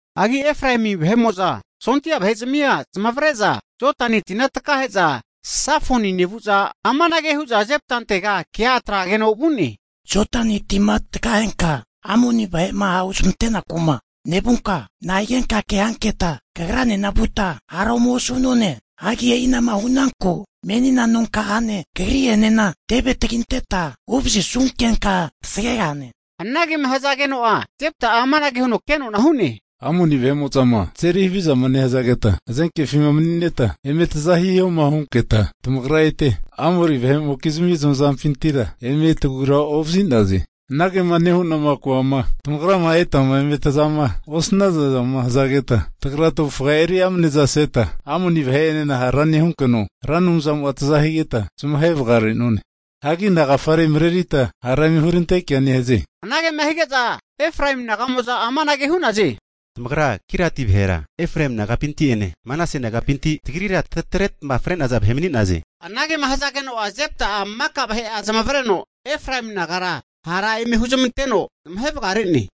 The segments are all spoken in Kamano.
Hagi Efraemi vahe'mo'za sondia vahe'zmia nezmavre'za Jodani tina takahe'za Safoni nevu'za amanage hu'za Jeptantega kea atrageno vu'ne. Jodani tima takahenka Amoni vahe'ma hahuzmante'naku'ma nevunka, nahigenka kea hanketa kagra'enena vuta hara ome osu'none? Hagi e'inama hu'naku menina nonka'ane kagri'enena teve taginteta huvazisunkenka tasagegahane. Anagema hazageno'a Jepta'a amanage huno kenona hu'ne, Amoni vahe'mo'zama tazeri havizama nehazageta hazenkefima mani'neta eme taza hihoma hunketa, tamagra eta Amoni vahe'mokizmi zamazampintira eme tagura ovazi'naze. Anagema nehu'nama koama tamagrama etama eme tazama osnazazama hazageta, tagra tavufa eri amanezaseta Amoni vahe'enena hara nehunkeno, Ra Anumzamo'a taza higeta zamahe vagare'none. Hagi nagafare marerita hara eme hurantekea nehaze? Anagema hige'za Efraemi naga'mo'za amanage hu'naze, Tamagra Giliati vahera Efraemi nagapinti'ene Manase nagapinti tagrira tatretma fre'naza vahe mani'naze. Anagema hazageno'a, Jepta'a maka vahe'a zamavareno Efraemi nagara hara eme huzamanteno zamahe vagare'ne.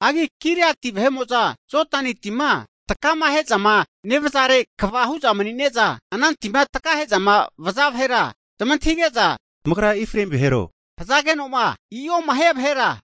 Hagi Giliati vahe'mo'za Jodani tima takamahe'zama nevazare kva hu'za mani'ne'za, ana tima takahe'zama vaza vahera zamantahige'za, tamagra Efraemi vahero, hazageno'ma i'oma hia vahera,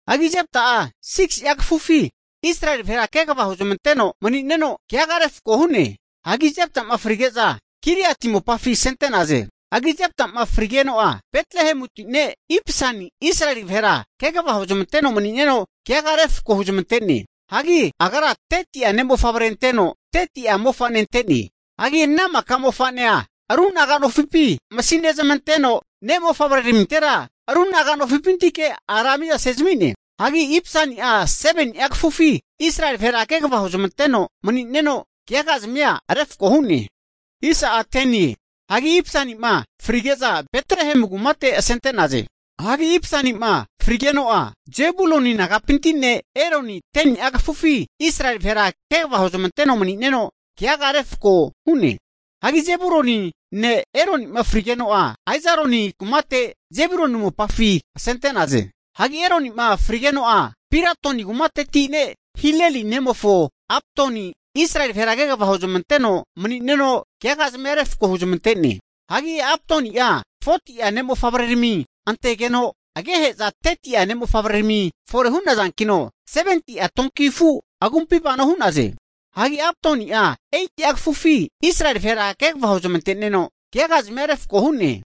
Hagi Jepta'a 6si'a kafufi Israeli vahera kegava huzmanteno mani'neno, keaga refko hu'ne. Hagi Jepta'ma frige'za Giliati mopafi asente'naze. Hagi Jepta'ma frigeno'a Betlehemuti ne' Ipsan Israeli vahera kegava huzmanteno mani'neno keaga refko huzmante'ne. Hagi agra 30'a ne' mofavre zamanteno, 30'a mofane zamante'ne. Hagi ana maka mofane'a ru naga nofipi masinezmanteno, ne' mofavrearamintera ru naga nofipintike ara hagezamine. Hagi Ipsani'a 7ni'a kafufi Israeli vahera kegava huzmanteno mani'neno, keagazmia refko hu'ne. Hagi Ipsanima frige'za Betlehemu kumate asente'naze. Hagi Ipsani'ma frigeno'a, Zebuluni nagapinti ne' Eloni 10ni'a kafufi Israeli vahera kegava huzmanteno mani'neno keaga refko hu'ne. Hagi Zebuluni ne' Eloni'ma frigeno'a, Aijaloni kumate Zebuluni mopafi asente'naze. Hagi Eloni'ma frigeno'a, Piratoni kumateti ne' Hileli nemofo Abdoni Israeli vahera kegava huzmanteno mani'neno keagazimia refko huzmante'ne. Hagi Abdoni'a 40'a ne'mofavrerami antegeno agehe'za 30'a ne' mofavrerami fore hu'nazankino, 70'a donki afu agumpi vano hu'naze. Hagi Abdoni'a 8'a kafufi Israeli vahera kegava huzmante'neno keagazimia refko hu'ne.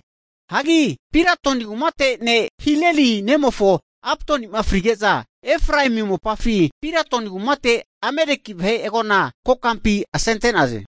Hagi Piratoni kumate ne' Hileli ne'mofo Abdoni'ma frige'za, Efraemi mopafi Piratoni kumate Ameleki vahe agona kokampi asente'naze.